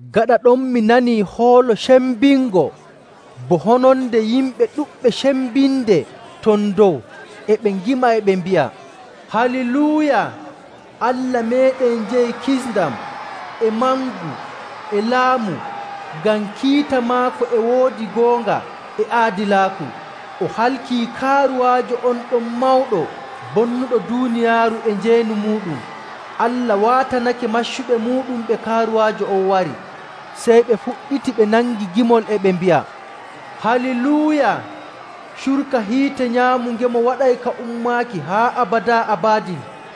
Gaɗa ɗon mi nanii hoolo cembingo bo hononde yimɓe ɗuɗɓe cembinde ton dow e ɓe ngima e ɓe mbi'a, “Haaliluuya! Allah meeɗen jeyi kisndam e mangu e laamu, ngam kiita maako e woodi goonga e aadilaaku, o halkii kaaruwaajo on ɗon mawɗo bonnuɗo duuniyaaru e njeenu muuɗum. Allah waatanake maccuɓe muuɗum ɓe kaaruwaajo on wari.” Sey ɓe fuɗɗiti ɓe nangi gimol e ɓe mbi'a, “Haaliluuya! Curka hiite nyaamungemo waɗay ka ummaaki haa abadaa abadin.”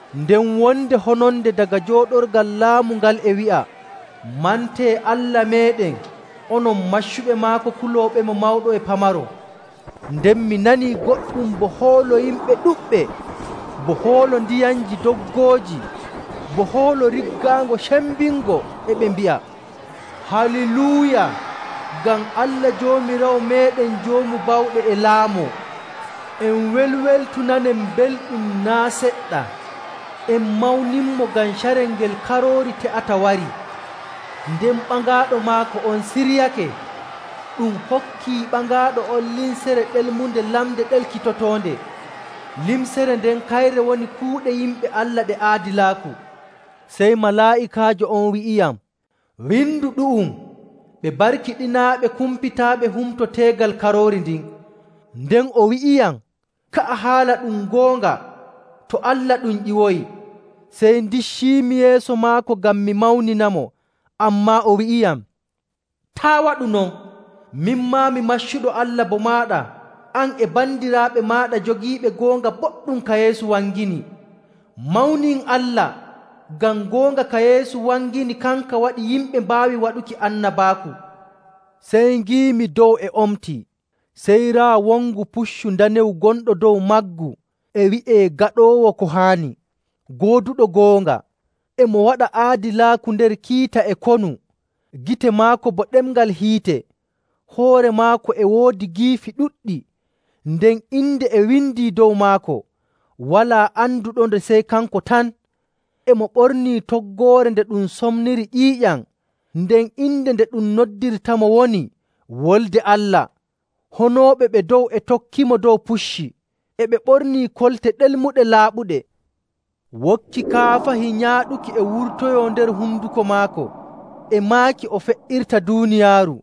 Nden wonde hononde daga jooɗorgal laamu ngal e wi'a, “Mantee Allah meeɗen, onon maccuɓe maako kulooɓemo mawɗo e pamaro.” Nden mi nanii goɗɗum bo hoolo yimɓe ɗuɗɓe, bo hoolo ndiyamji doggooji, bo hoolo riggaango cembingo, e ɓe mbi'a, “Haaliluuya! Ngam Allah Joomiraawo meeɗen Joomu Bawɗe e laamoo! En welweltu nanen belɗum naa' seɗɗa, en mawninmo, ngam carel ngel Karoori te'ata warii. Nden ɓaŋaaɗo maako on siryake. Ɗum hokkii ɓaŋaaɗo on limcere ɗelmunde lamnde ɗelkitotoonde. Limcere nden kayre woni kuuɗe yimɓe Allah ɗe aadilaaku.” Sey malaa'ikaajo on wi'iyam, “Windu ɗu'um. Ɓe barkiɗinaaɓe kumpitaaɓe humto teegal Karoori ndin.” Nden o wi'iyam, “Ka'a haala ɗum goonga, to Allah ɗum ƴiwoyi.” Sey ndicciimi yeeso maako ngam mi mawninamo, ammaa o wi'iyam, “Taa' waɗu non! Min maa, mi maccuɗo Allah bo maaɗa, an e bandiraaɓe maaɗa jogiiɓe goonga boɗɗum ka Yeesu wangini. Mawnin Allah! Ngam goonga ka Yeesu wangini kanka waɗi yimɓe mbaawi waɗuki annabaaku.” Sey ngiimi dow e omtii, sey raa wongu puccu ndanewu gonɗo dow maggu, e wi'ee Gaɗoowo Ko Haani, Gooduɗo Goonga. E mo waɗa aadilaaku nder kiita e konu. Gite maako bo ɗemngal hiite, hoore maako e woodi giifi ɗuɗɗi, nden inde e windii dow maako, walaa anduɗonde sey kanko tan. E mo ɓornii toggoore nde ɗum somniri ƴiiƴam, nden inde nde ɗum noddirtamo woni, “Wolde Allah.” Honooɓe ɓe dow e tokkimo dow pucci, e ɓe bornii kolte ɗelmuɗe laaɓuɗe. Wokki kaafahi nyaaɗuki e wurtoyoo nder honduko maako, e maaki o fe''irta duuniyaaru,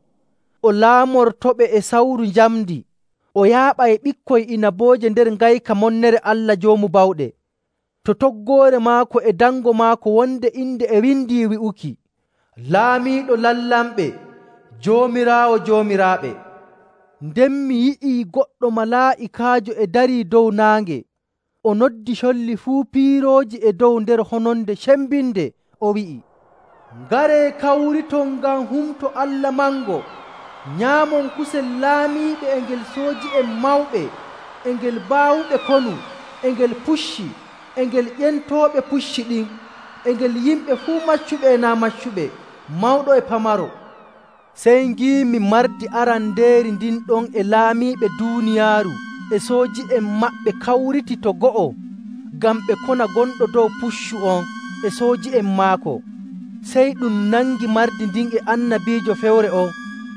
o laamortoɓe e sawru njamndi, o yaaɓay ɓikkoy inabooje nder ngayka monnere Allah Joomu Bawɗe. To toggoore maako e dango maako wonde inde e windii wi'uki, “Laamiiɗo lamlamɓe, Joomiraawo joomiraaɓe.” Nden mi yi'i goɗɗo malaa'ikaajo e darii dow naange, o noddi colli fuu piirooji e dow nder hononde cembinde, o wi'i, “Ngaree kawriton ngam humto Allah mango, nyaamon kusel laamiiɓe, e ngel sooji'en mawɓe, e ngel baawuɓe konu, e ngel pucci, e ngel ƴentooɓe pucci ɗin, e ngel yimɓe fuu maccuɓe e naa' maccuɓe, mawɗo e pamaro!” Sey ngiimi mardi arandeeri ndin ɗon e laamiiɓe duuniyaaru e sooji'en maɓɓe kawritii to go'o ngam ɓe kona gonɗo dow puccu on e sooji'en maako. Sey ɗum nangi mardi ndin e annabiijo fewre on.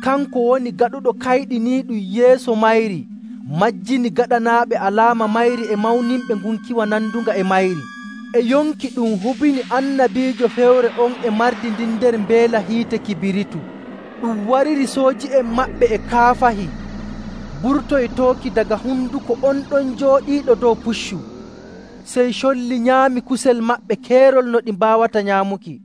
Kanko woni gaɗuɗo kayɗiniiɗum yeeso mayri majjini gaɗanaaɓe alaama mayri e mawninɓe ngunkiwa nandunga e mayri. E yonki ɗum hubini annabiijo fewre on e mardi ndin nder mbeela hiite kibiritu. Ɗum wariri sooji'en maɓɓe e kaafahi burtoytooki daga honduko on ɗon jooɗiiɗo dow puccu. Sey colli nyaami kusel maɓɓe keerol no ɗi mbaawata nyaamuki.